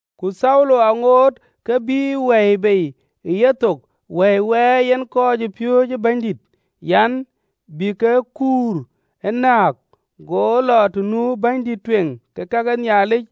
Ku Thaulo, aŋoot ke bïï wɛ̈i bei ë yethok wɛ̈i wɛɛi yen kɔcpiööcë Bɛ̈nydït an, bï ke kuur ë näk, go lɔ të nu bɛ̈nydïït ë kake Nhialic,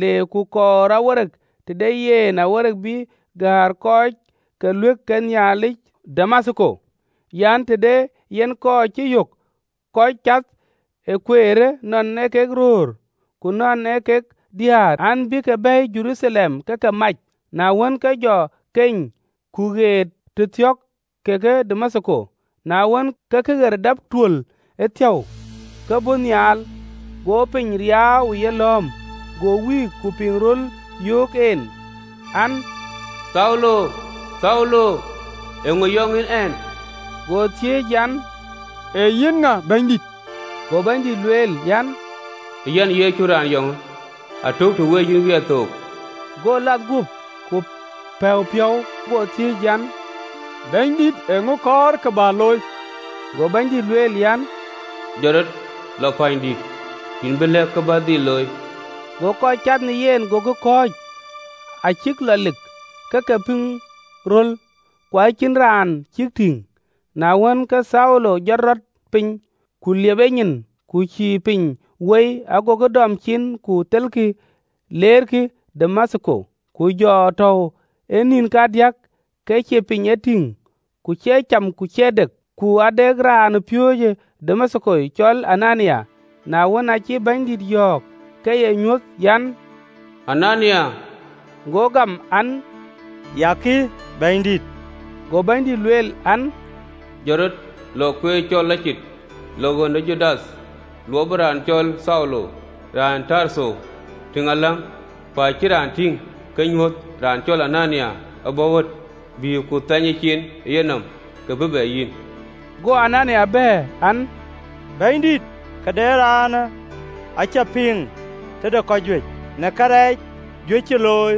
le ku kɔɔr awereek tëde yen awereek bï gäär kɔc ke ɣööt ke Nhialic ë Damathko an, të de yen kɔc cï yök kɔc cath ee Kueerë, nɔn ee kek röör, ku nɔn ee kek diäär an, bï ke bɛ̈ɛ̈i Jeruthalem, ke ke mac. Na wën, ke jɔ keny, ku ɣet tëthiɔ̈k ke Damathko: na wën, kë këɣer dap tuöl ëthiäu, ke bɔ̈ nhial, go piny riaau ë yelɔ̈ɔ̈m. Go wïïk, ku piŋ röl yöök en an, “Thaulo, Thaulo, eeŋö yɔŋ yïn ɛn?” Go thiëëc an, “Ee yïn ŋa, Bɛ̈nydït?” Go Bɛ̈nydït lueel an, “Ee Yɛn Yecu raan yɔŋë: atök të wec yïn wiɛth thook.” Go lath, guöp ku pɛ̈u piɔ̈u, go thiëëc an, “Bɛ̈nydït, eeŋö kɔɔr kë bä looi?” Go Bɛ̈nydït lueel an, “Jɔt rɔt, lɔ pänydït, yïn bï lɛ̈k kë bä looi.” Go kɔc cath në yen gokï kɔ̈ɔ̈c, acïk lɔ lik, ke ke piŋ röl, ku acïn raan cïk tïŋ. Na wën, ke Thaulo jɔt rɔt piny, ku liep enyin, ku cïï piny woi, agokï dɔm cin, ku thelkï, leerkï Damathko. Ku jɔ tɔ̈u ë nïn kadiäk ke cïï piny ee tïŋ, ku cïï cäm ku cïï dëk. Ku ade raanpiööcë Damathko, cɔl Anania, na wën, aacï Bɛ̈nydït yɔ̈ɔ̈k, ke ee nyuöth an, “Anania!” Go gam an, “Ya kï, Bɛ̈nydït.” Go Bɛ̈nydït lueel an, “Jɔt rɔt, lɔ kueer cɔl Lɔcit, lɔ ɣön ë Judath lɔ luɔpë raan cɔl Thaulo, raan ë Tartho, tïŋ aläŋ, ku acï raan tïŋ ke ee nyuöth, raan cɔl Anania abɔ̈ ɣöt, bï ku thɛny ecin ë yenɔm, ke bï bɛ yïn.” Go Anania bɛ̈ɛ̈r, an, “Bɛ̈nydït, këde raanë acä piŋ tëde kɔc juëc, në karɛc juëc cï luöi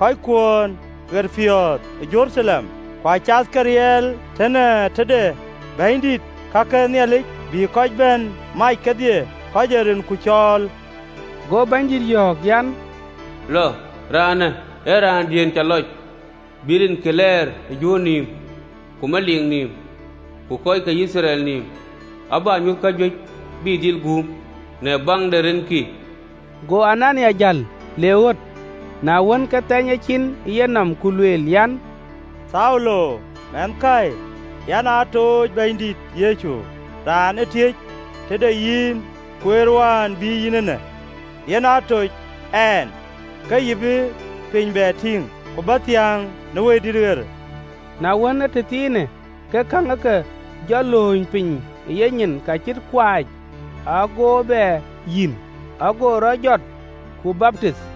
kɔckuön ɣerpiɔ̈ɔ̈th ë Jeruthalem. Ku acath ke riɛl ee tënë tëde bänydït ke ka Nhialic, bï kɔc bɛ̈n mac kedhie kɔc ee rinku cɔɔl.” Go Bɛ̈nydït yɔ̈ɔ̈k an, “Lɔɔr, raanë ee raandiën cä lɔc, bï rinkï lɛɛr ë Juöör nïïm, ku meliik nïïm, ku kɔc ke Yithriɛl nïïm. Ku abä nyuöth kajuëc bï dhil guum në baŋ de rinkï.” Go Anania jäl, le ɣöt, na wën, ke thɛny ecin ë yenɔm, ku lueel an, “Thaulo mɛnhkäi, yɛn aa tooc Bɛ̈nydït Yecu, raan ë tiëc tëde yïn kueer wään bï yïn eenë, yen aa toc ɛn, ke yï bï piny bɛ tïŋ, ku bä thiäŋ në Wëidït ɣer.” Na wën, ee tëthiinë, ke käŋ ë ke jɔ lööny piny ë yenyin kacït kuɛc, ago bɛ yïn, ago rɔt jɔt, ku baptith,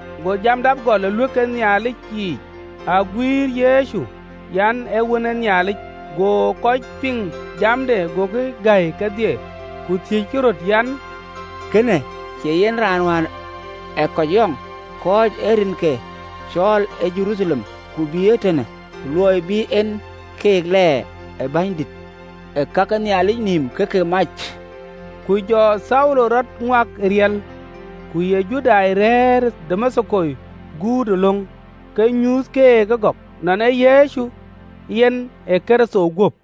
Go jam dap gɔl ë ɣööt ke Nhialic yiic, aguiir Yecu an, ee Wën ë Nhialic. Go kɔc piŋ jamde agokï gäi kedhie, ku thiëckï röt an, “Kënë cie yen ee raan wään ee kɔc yɔŋ, kɔc ee rinkë cɔɔl ë Jeruthalem, ku bï ee tënë, luɔi bï en keek lɛɛr ë bänydït ke ka ke Nhialic nïïm ke ke mac?” Ku jɔ Thaulo rɔt ŋuak ë riɛl, ku ye Judai rɛ̈ɛ̈r ë Damathko guut ë löŋ, ke nyuuth keek ëgɔk, nɔn ee Yecu yen ee Kërtho guöp.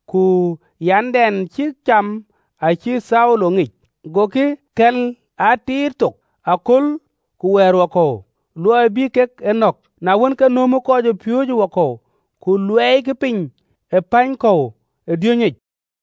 ku yandɛn cïk cam acïï Thaulo ŋic. Gokï kɛ̈l aa tiit thook aköl ku wɛ̈ɛ̈rwakɔ̈u, luɔi bï kek e nɔ̈k. Na wën, ke nööm kɔcpiööcë wakɔ̈u, ku luɛɛikï piny ë päny kɔ̈u ë diönyic.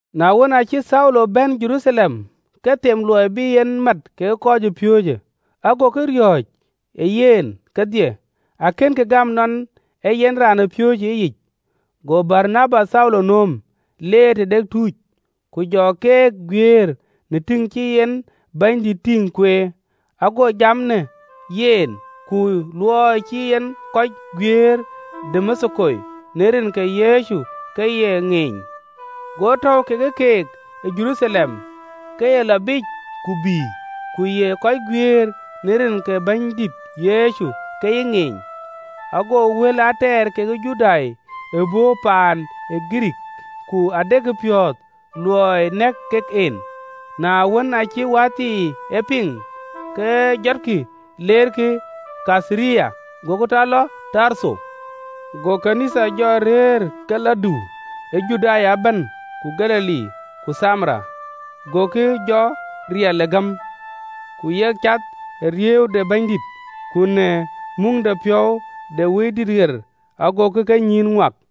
Na wën, aacï Thaulo bɛ̈n Jeruthalem, ke them luɔi bï en mat kekë kɔcpiööcë, agokï riɔ̈ɔ̈c ë yen kedhie, akënkï gam nɔn ee yen raanpiööcë ëyic. Go Baranaba Thaulo nööm, leer tëde tuuc, ku jɔ keek guiëër në tïŋ cï en Bɛ̈nydït tïŋ kueer, ago jam në yen, ku luɔi cï en kɔc guiëër ë Damathko në rin ke Yecu ke ye ŋeeny. Go tɔ̈u kekë keek ë Jeruthalem, ke ye lɔ biic ku bï, ku ye kɔc guiëër në rin ke Bɛ̈nydït Yecu ke ye ŋeeny, go wël aa tɛɛr kekë Judai ëbɔ̈ paan ë Girikii, ku adekï piɔ̈ɔ̈th luɔi nɛ̈k kek en. Na wën, aacï wäthii e piŋ, ke jɔtkï leerkï Kaitharia, gokï tɔ lɔ Tartho. Go ɣööt ke Nhialic jɔ rëër ke ke lɔ dïu ë Juda ëbɛ̈n ku Galili ku Thamaria, gokï jɔ riɛl ë gäm, ku yek cath ë riëëu de Bɛ̈nydït, ku në muŋdepiɔ̈u de Wëidït ɣer, agokï kenyïïn ŋuak.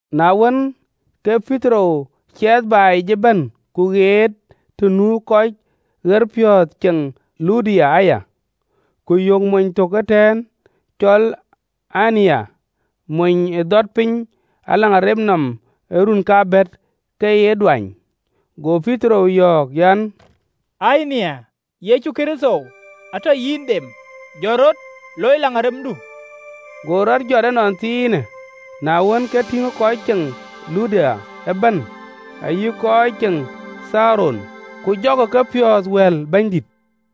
Na wën, ke Petero ciɛɛth baai yic ëbɛ̈n, ku jɔ ɣet tënu kɔc ɣerpiɔ̈ɔ̈th ceŋ Luda aya. Ku yök mony tök ëtɛ̈ɛ̈n, cɔl Ayina, mony ee dhɔt piny në agen nɔm ë run aa bɛ̈t, ke ye aduany. Go Petero yɔ̈ɔ̈k an, “Ayina, Yecu Kërtho atɔ yïn dem: jɔt rɔt, loi agendu.” Go rɔt jɔt ënɔnthiinë. Na wën, ke tïŋ kɔc ceŋ Luda ëbɛ̈n ayï kɔc ceŋ Caron, ku jɔkï kepiɔ̈ɔ̈th wɛ̈l Bɛ̈nydït.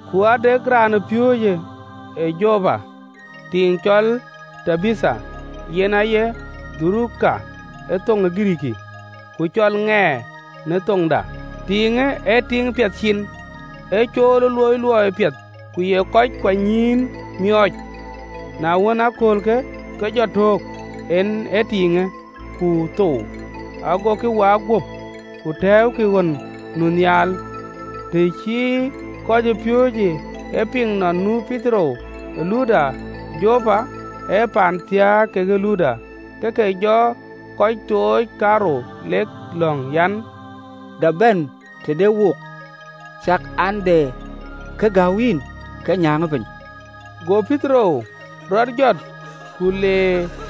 Ku ade raanpiööcë ë Jopa, tiiŋ cɔl Tabitha, yen aye Doruka ë thoŋ ë Girikii (ku cɔl ŋɛɛr në thoŋda): tiiŋë ee tiiŋ piɛth cin, ee cool ë loi luɔi piɛth, ku ye kɔc kuanynyïïn miɔɔc. Na wën, ë aköölkë, ke jɔ thöök, en tiiŋë, ku thou, gokï waak guöp, ku tɛ̈ɛ̈ukï ɣön nu nhial. Të cï kɔcpiööcë e piŋ nɔn nu Petero ë Luda, (Jopa ee paan thiääk ke Luda), ke ke jɔ kɔc tooc kaarou, lek lɔ̈ŋ an, “Dap bɛ̈n tëde wook, cak, an, de kë gäu yïn, ke nyääŋë piny.” Go Petero rɔt jɔt ku le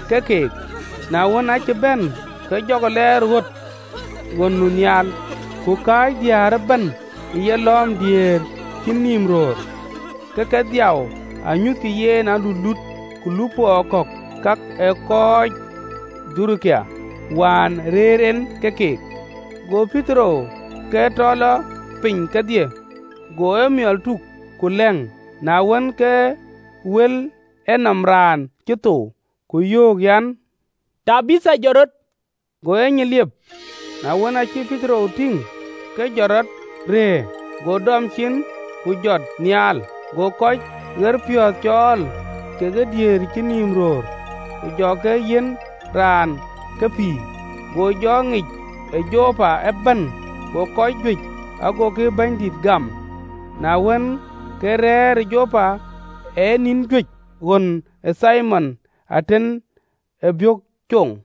ke keek. Na wën, aacï bɛ̈n, ke jɔkï lɛɛr ɣöt ɣön nu nhial: ku kääc diäär ëbɛ̈n ë yelɔ̈ɔ̈m diëër cïn nïïm röör, ke ke dhiau, anyuthkï yen aluluut ku lupɔɔ kɔ̈k kak ë kɔɔc Doruka, wään rëër en ke keek. Go Petero ke tɔ lɔ biic kedhie, go emiɔl tuk ku lɛ̈ŋ, na wën, ke wɛ̈l enɔm raan cï thou, ku yöök an, “Tabitha, jɔt rɔt!” Go enyin liep: na wën, aacï Petero tïŋ, ke jɔt rɔt rëër. Go dɔm cin, ku jɔt nhial, go kɔc ɣerpiɔ̈ɔ̈th cɔɔl kekë diëër cïn nïïm röör, ku jɔ ke yiɛ̈n raan ke pïïr. Go jɔ ŋic ë Jopa ëbɛ̈n, go kɔc juëc agokï Bɛ̈nydït gam. Na wën, ke rɛ̈ɛ̈r ë Jopa ë nïn juëc ɣön ë Thimon, atën ee biök coŋ.